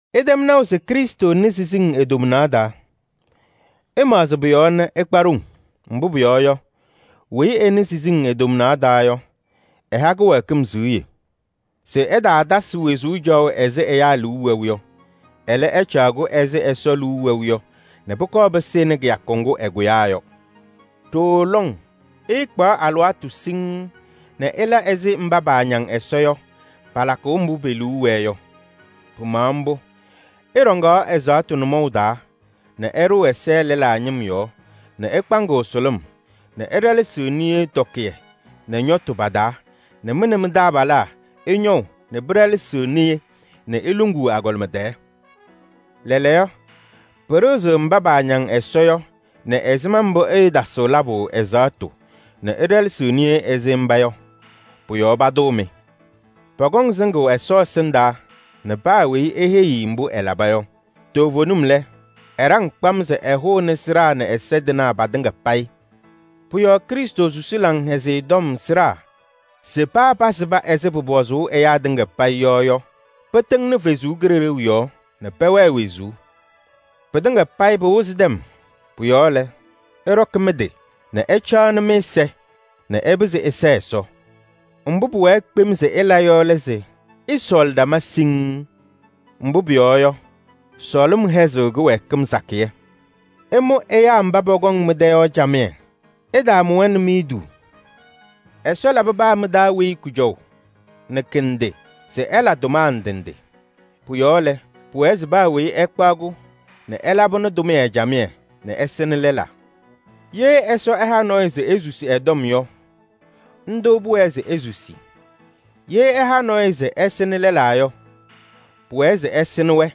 Ɩtɛm naʋ se Krɩstʋ nɩ siziŋ e-tomnaɣ taa. Ɩmaɣzɩ pʋ-yɔɔ nɛ ɩkpa ɖoŋ. Mbʋ pʋyɔɔ yɔ, weyi ɛnɩ siziŋ e-tomnaɣ taa yɔ, ɛha kɩwɛɛkɩm siɣye se ɛtaatasɩ wezuu caɣʋ ɛzɩ ɛyaa liu wɛʋ yɔ. Ɛlɛ, ɛcaɣ-kʋ ɛzɩ Ɛsɔ liu wɛʋ yɔ nɛ pʋkɔɔ pɩsɩnɩ kɩyakʋ ŋgʋ ɛkʋyaa yɔ. Ɖooo lɔŋ ɩɩkpaɣ alɩwaatʋ siŋŋ nɛ ɩla ɛzɩ mba paañaŋ Ɛsɔ yɔ palakʋʋ mbʋ pe-liu wɛɛ yɔ. Pɩmaɣ mbʋ. Ɩɖɔŋaɣ ɛzaɣtʋ nʋmɔʋ taa nɛ ɩɖʋʋ ɛza lɛlaa ñɩm yɔɔ nɛ ɩkpaŋɩɣ sʋlʋm nɛ ɩɖɛlɛsɩɣ niye tɔkɩyɛ nɛ ñɔtʋ pa-taa nɛ mɩ nɛ mɩ-taabalaa ɩñɔʋ nɛ pɩɖɛlɛsɩɣ niye nɛ iluŋuu agɔlɩma tɛɛ. Lɛɛlɛɛyɔ, pɩɖɩɣzɩɣ mba paañaŋ Ɛsɔ yɔ nɛ ɛzɩma mbʋ ɩɩtaasɩɣ labʋ ɛzaɣtʋ nɛ ɩɖɛlɛsɩɣ niye ɛzɩ mba yɔ. Pʋ-yɔɔ patʋʋ-mɩ. Pɔkɔŋ sɩŋʋʋ Ɛsɔ ɛsɩndaa nɛ paa weyi eheyi-i mbʋ ɛlaba yɔ. Toovenim lɛ, ɛɖaŋ kpam se ɛhʋnɩ sɩɖaa nɛ ɛza tɩnaa patɩŋa payɩ. Pʋ-yɔɔ Krɩstʋ susi Laŋhɛzɩyɛ Tɔm sɩɖaa se paa pasɩba ɛzɩ pʋpɔzʋʋ ɛyaa tɩŋa payɩ yɔ yɔ, pɩtɩŋnɩ Ɛsɔ Kalɩzaɣ yɔɔ nɛ pɛwɛɛ wezuu. Pɩtɩŋa payɩ pɩwɩzɩ tɛm. Pʋ-yɔɔ lɛ, ɩɖɔkɩ mɩ-tɩ nɛ ɩcaɣnɩ mɩ-ɛza nɛ ɩpɩzɩ ɩsɛɛ Ɛsɔ. Mbʋ pʋwɛɛ kpem se ɩla yɔ lɛ se ɩsɔɔlɩ ɖama siŋŋ. Mbʋ pʋyɔɔ yɔ, sɔɔlɩm hɛzɩɣ kɩwɛɛkɩm sakɩyɛ. Ɩmʋ ɛyaa mba pɔkɔŋ mɩ-tɛ yɔ camɩyɛ. Ɩtaamʋ-wɛ nɛ miduu. Ɛsɔ labɩ paa mɩ-taa weyi kʋjɔʋ nɛ kɩ-ndɩ se ɛla tʋma ndɩ ndɩ. Pʋ-yɔɔ lɛ, pʋwɛɛ se paa weyi ɛkpaɣ-kʋ nɛ ɛlabɩnɩ tʋmɩyɛ camɩyɛ nɛ ɛsɩnɩ lɛlaa. Ye Ɛsɔ ɛha nɔɔyʋ se esusi ɛ-tɔm yɔ, ndʋ pʋwɛɛ se esusi. Ye ɛha nɔɔyʋ se ɛsɩnɩ lɛlaa yɔ, pʋwɛɛ se ɛsɩnɩ-wɛ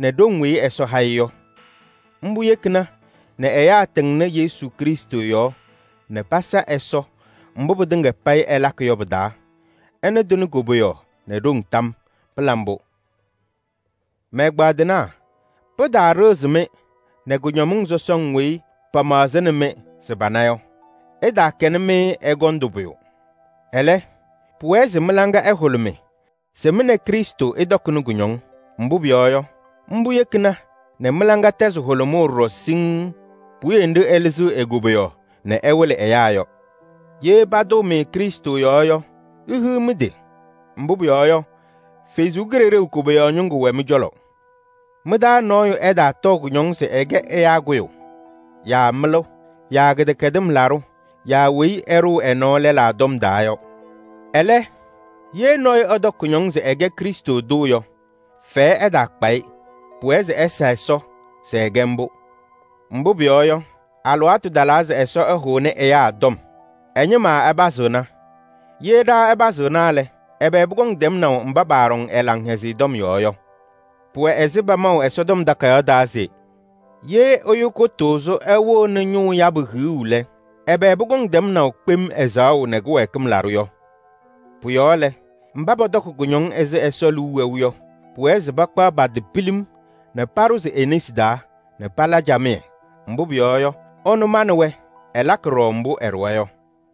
nɛ ɖoŋ weyi Ɛsɔ ha-ɩ yɔ. Mbʋ yekina nɛ ɛyaa tɩŋnɩ Yesu Krɩstʋ yɔɔ nɛ pasa Ɛsɔ mbʋ pɩtɩŋa payɩ ɩlakɩ yɔ pɩ-taa. Ɛnʋ tɩnɩ koboyaɣ nɛ ɖoŋ tam yɔɔ. Pɩla mbʋ! Mɛ-ɛgbaadɩnaa! Pɩtaaɖɩɣzɩ-mɩ nɛ kʋñɔmɩŋ sɔsɔŋ weyi pamaɣzɩɣnɩ-mɩ se pana yɔ. Ɩtaakɛnɩ-mɩ ɛgɔndʋ pʋyʋ. Ɛlɛ, pʋwɛɛ se mɩ-laŋa ɛhʋlʋmɩ se mɩ nɛ Krɩstʋ ɩtɔkɩnɩ kʋñɔŋ. Mbʋ pʋyɔɔ yɔ, mbʋ yekina nɛ mɩ-laŋa tɛzɩ hʋlʋmʋʋ ɖɔɖɔ siŋŋ puwiye nɖɩ ɛlɩzɩɣ e-koboyaɣ nɛ ɛwɩlɩ ɛyaa yɔ. Ye patʋʋ-mɩ Krɩstʋ yɔɔ yɔ, ihiɣ mɩ-tɩ! Mbʋ pʋyɔɔ yɔ, Ɛsɔ Kalɩzaɣ koboyaɣ ñɩŋga wɛ mɩ-cɔlɔ. Mɩ-taa nɔɔyʋ ɛtaatɔɔ kʋñɔŋ se ɛkɛ ɛyaa kʋyʋ yaa mɩlʋ yaa kɩdɛkɛdɩm laɖʋ yaa weyi ɛɖʋʋ ɛ-nɔɔ lɛlaa tɔm taa yɔ. Ɛlɛ, ye nɔɔyʋ ɛtɔkɩ kʋñɔŋ se ɛkɛ Krɩstʋ tʋ yɔ, fɛyɛ ɛtaakpa-ɩ. Pʋwɛɛ se ɛsa Ɛsɔ se ɛkɛ mbʋ. Mbʋ pʋyɔɔ yɔ, alɩwaatʋ talaa se Ɛsɔ ɛhʋnɩ ɛyaa tɔm. Ɛ-ñɩma ɛpazɩɣna. Ye ɖa ɛpazɩɣna lɛ, ɛbɛ pʋkɔŋ tɛmnaʋ mba paaɖɔŋ ɛ-Laŋhɛzɩyɛ tɔm yɔɔ yɔ? Pʋwɛ ɛzɩ pamaʋ se: “Ye ɛyʋ kʋtʋʋzʋ ɛwɩɣnɩ ñʋʋ yabʋ hiɣu lɛ, ɛbɛ pʋkɔŋ tɛmnaʋ kpem ɛzaɣʋ nɛ kɩwɛɛkɩm laɖʋ yɔ?” Pʋ-yɔɔ lɛ, mba pɔtɔkɩ kʋñɔŋ ɛzɩ Ɛsɔ liu wɛʋ yɔ, pʋwɛɛ se pakpaɣ pa-tɩ pilim nɛ paɖʋzɩ e-nesi taa nɛ pala camɩyɛ. Mbʋ pʋyɔɔ yɔ, ɛnʋ manɩ-wɛ, ɛlakɩ ɖɔɖɔ mbʋ ɛɖʋwa yɔ.